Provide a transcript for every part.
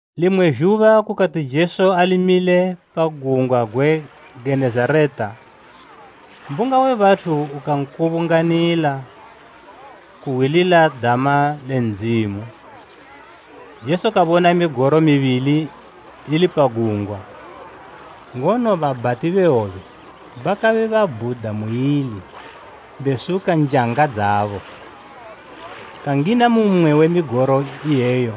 Limwe zhuba kukati Jesu ali mile pa gungwa gwe Genezareta, mbunga we bathu ukankubunganila kuhwilila dama le Ndzimu. Jesu kabona migoro mibili ili pa gungwa, ngono babhati be hwobe bakabe babhuda muili besuka njanga dzabo. Kangina mu mmwe we migoro iyeyo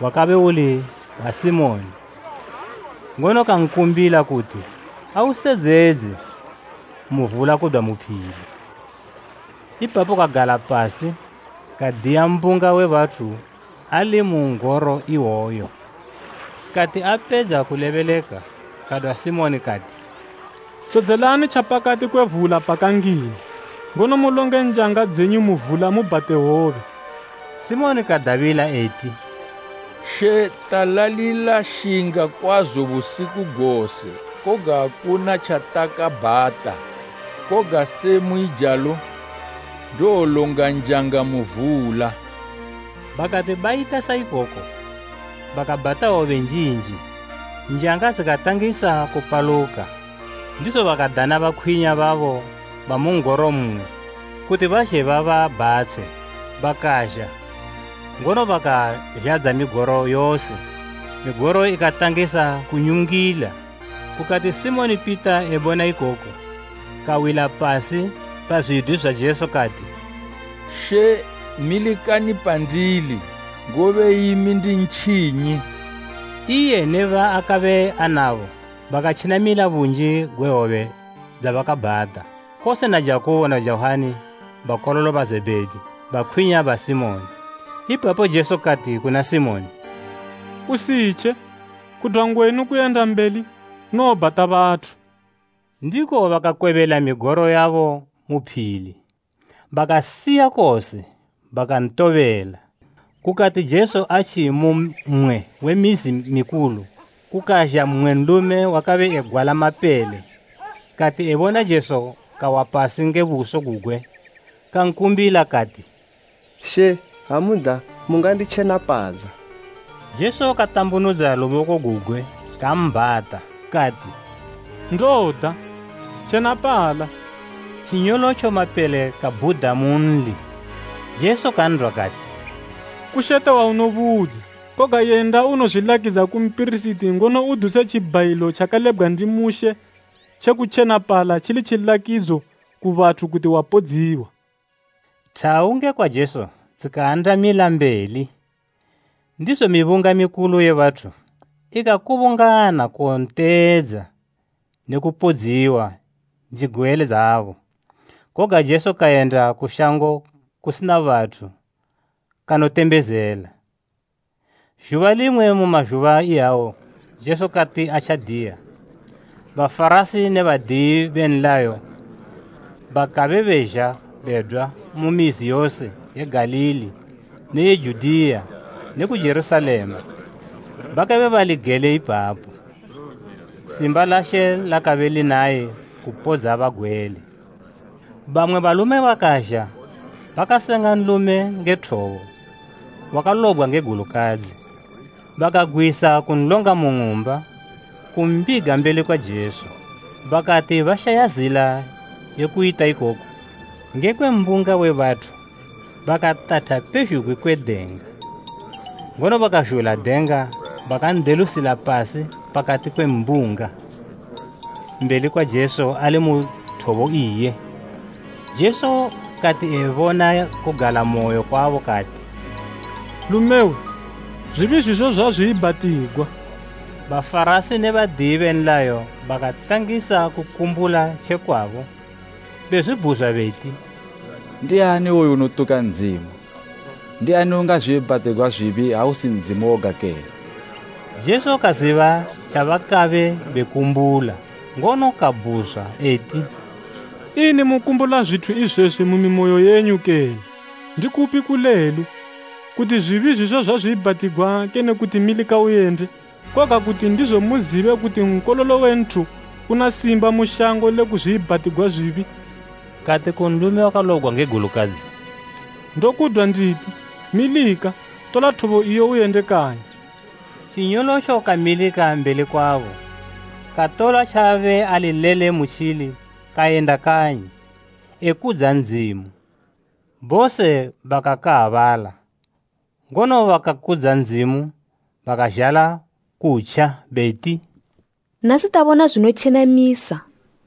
wakabe uli wa Simoni, ngono kankumbila kuti ausedzedze mu vula kudwa mu phili. Ipapo kagala pasi kadiya mbunga we bathu ali mu n'goro iwoyo. Kati apedza kulebeleka, kadwa Simoni kati, “Sedzelani tjapakati kwe vula pakangina, ngono mulonge njanga dzenyu mu vula mubhate hwobe.” Simoni kadabila eti, “She, talalila shinga kwazo busiku gose, koga akuna tjatakabhata. Koga se muijalo, ndowolonga njanga mu vula.” Bakati bayita sa ikoko bakabhata hwobe njinji, njanga dzikatangisa kupaluka. Ndizo bakadana bakwinya babo bamu n'goro mmwe, kuti bazhe bababhatshe. Bakazha, ngono bakazhadza migoro yose, migoro ikatangisa kunyungila. Kukati Simoni Pita ebona ikoku, kawila pasi pa zwidwi zwa Jesu, kati, “She milikani pandili, ngobe imi ndi ntjinyi!” Iye ne baakabe anabo, bakatjenamila bunji gwe hwobe dzabakabhata, kose na Jakubo na Johani bakololo ba Zebhedi, bakwinya ba Simoni. Ipapo Jesu kati kuna Simoni, “Usitje. Kudwa ngwenu kuyenda mbeli, unowobhata bathu.” Ndiko bakakwebela migoro yabo mu phili, bakasiya kose, bakantobela. Kukati Jesu atji mu mmwe we mizi mikulu, kukazha mmwe nlume wakabe egwala mapele. Kati ebona Jesu kawa pasi nge buso gugwe kankumbila, kati, “She, ha muda, munganditjenapadza.” Jesu katambunudza luboko gugwe, kambhata, kati “Ndoda. Tjenapala!” Tjinyolotjo mapele kabhuda munli. Jesu kan'dwa kati, “Kushete waunobudza. Koga yenda unozwilakidza ku mpirisiti ngono uduse tjibhayilo tjakalebgwa ndi Mushe tjeku tjenapala tjili tjilakidzo ku bathu kuti wapodziwa.” Thawu ngekwa Jesu dzikaandamila mbeli, ndizo mibunga mikulu ye bathu ikakubungana kuwonteedza ne kupodziwa njigwele dzabo. Koga Jesu kayenda ku shango kusina bathu kanotembezela. Zhuba limwe mu mazhuba iyawo Jesu kati atjadiya, Bafarasi ne badiyi be nlayo bakabe bazha bedwa mu mizi yose ye Galili ne ye Judiya ne ku Jerusalema, bakabe bali gele ipapo. Simba la She lakabe linaye kupodza bagwele. Bamwe balume bakazha bakasenga nlume nge thobo wakalobgwa nge gulukadzi, bakagwisa kunlonga mu ng'umba, kumbiga mbeli kwa Jesu. Bakati bashaya zila ye kuyita ikoku ngekwe mbunga we bathu, bakatatha pezhugwi kwe denga, ngono bakazhula denga bakan'delusila pasi pakati kwe mbunga, mbeli kwa Jesu ali mu thobo iye. Jesu kati ebona kugalamoyo kwabo kati, “Lumewe, zwibi zwizo zwazwiibhatigwa.” Bafarasi ne badiyi be nlayo bakatangisa kukumbula tjekwabo, bezwibhuzwa beti, “Ndiani iwoyu unotuka Ndzimu? Ndiani ungazwiibhatigwa zwibi ha usi Ndzimu woga kene?” Jesu kaziba tjabakabe bekumbula, ngono kabhuzwa eti, “Ini mukumbula zwithu izwezwi mu mimoyo yenyu kene? Ndikupi kulelu, kuti, ‘Zwibi zwizo zwazwiibhatigwa,’ kene kuti, ‘Milika uyende?’ Koga, kuti ndizo muzibe kuti Nkololo we Nthu una simba mu shango le kuzwiibhatigwa zwibi, kati ku nlume wakalobgwa nge gulukadzi, ‘Ndokudwa nditi, milika, tola thobo iyo uyende kanyi.’” Tjinyolotjo kamilika mbeli kwabo, katola tjaabe ali lele mutjili kayenda kanyi, ekudza Ndzimu. Bose bakakaabala, ngono bakakudza Ndzimu. Bakazhala kutja, beti, “Nasi tabona zwinotjenamisa.”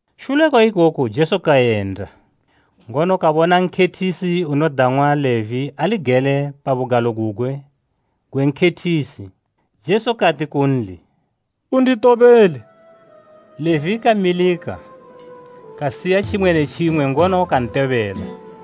Shule kwa ikoku Jesu kayenda, ngono kabona nkhethisi unodang'wa Levi ali gele pa bugalo gugwe gwe nkhethisi. Jesu kati kunli “Unditobele.” Levi kamilika, kasiya tjimwe ne tjimwe ngono kantobela.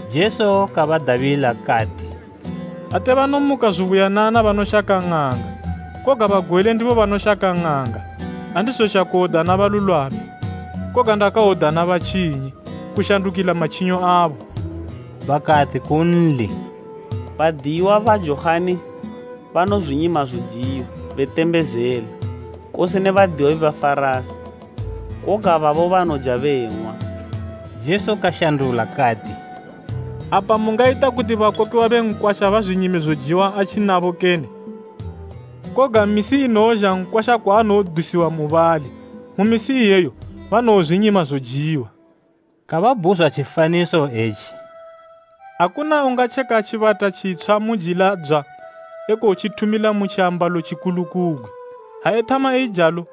Jesu kabadabila, kati, “Ate banomuka zubuyanana banoshaka ng'anga, koga bagwele ndibo banoshaka ng'anga. Andizozha kuwodana balulwami, koga ndakawodana batjinyi, kushandukila matjinyo abo.” Bakati kunli, “Badiyiwa ba Johani banozwinyima zojiwa betembezela, kose ne badiyiwa be Bafarasi, koga babo banoja beng'wa.” Jesu kashandula kati, “Apa mungayita kuti bakokiwa be nkwasha bazwinyime zojiwa atji nabo kene? Koga misi inowozha nkwasha kwaanowodusiwa mubali. Mu misi iyeyo banowozwinyima zojiwa.” Kababudza tjifaniso etji, “Akuna ungatjeka tjibata tjitshwa mujila dzwa ekotjithumila mu tjiambalo tjikulukugwi. Ha ethama eijalo,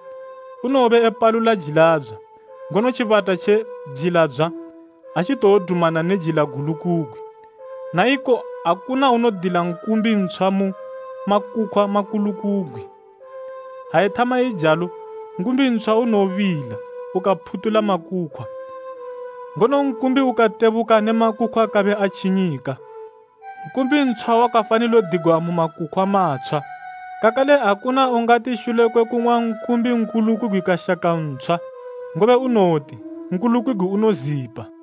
unowobe apalula jila dzwa, ngono tjibata tje jila dzwa ha tjitowodumana ne jila gulukugwi. Na iko akuna unodila nkumbi ntshwa mu makukhwa makulukugwi. Ha ethama eijalo, nkumbi ntshwa unowobila ukaphutula makukhwa, ngono nkumbi ukatebuka ne makukhwa kabe atjinyika. Nkumbi ntshwa wakafanilo digwa mu makukhwa matshwa. Kakale akuna ungati shule kwe kung'wa nkumbi nkulukugwi kashaka ntshwa, ngobe unowoti, ‘Nkulukugwi unozipa.’”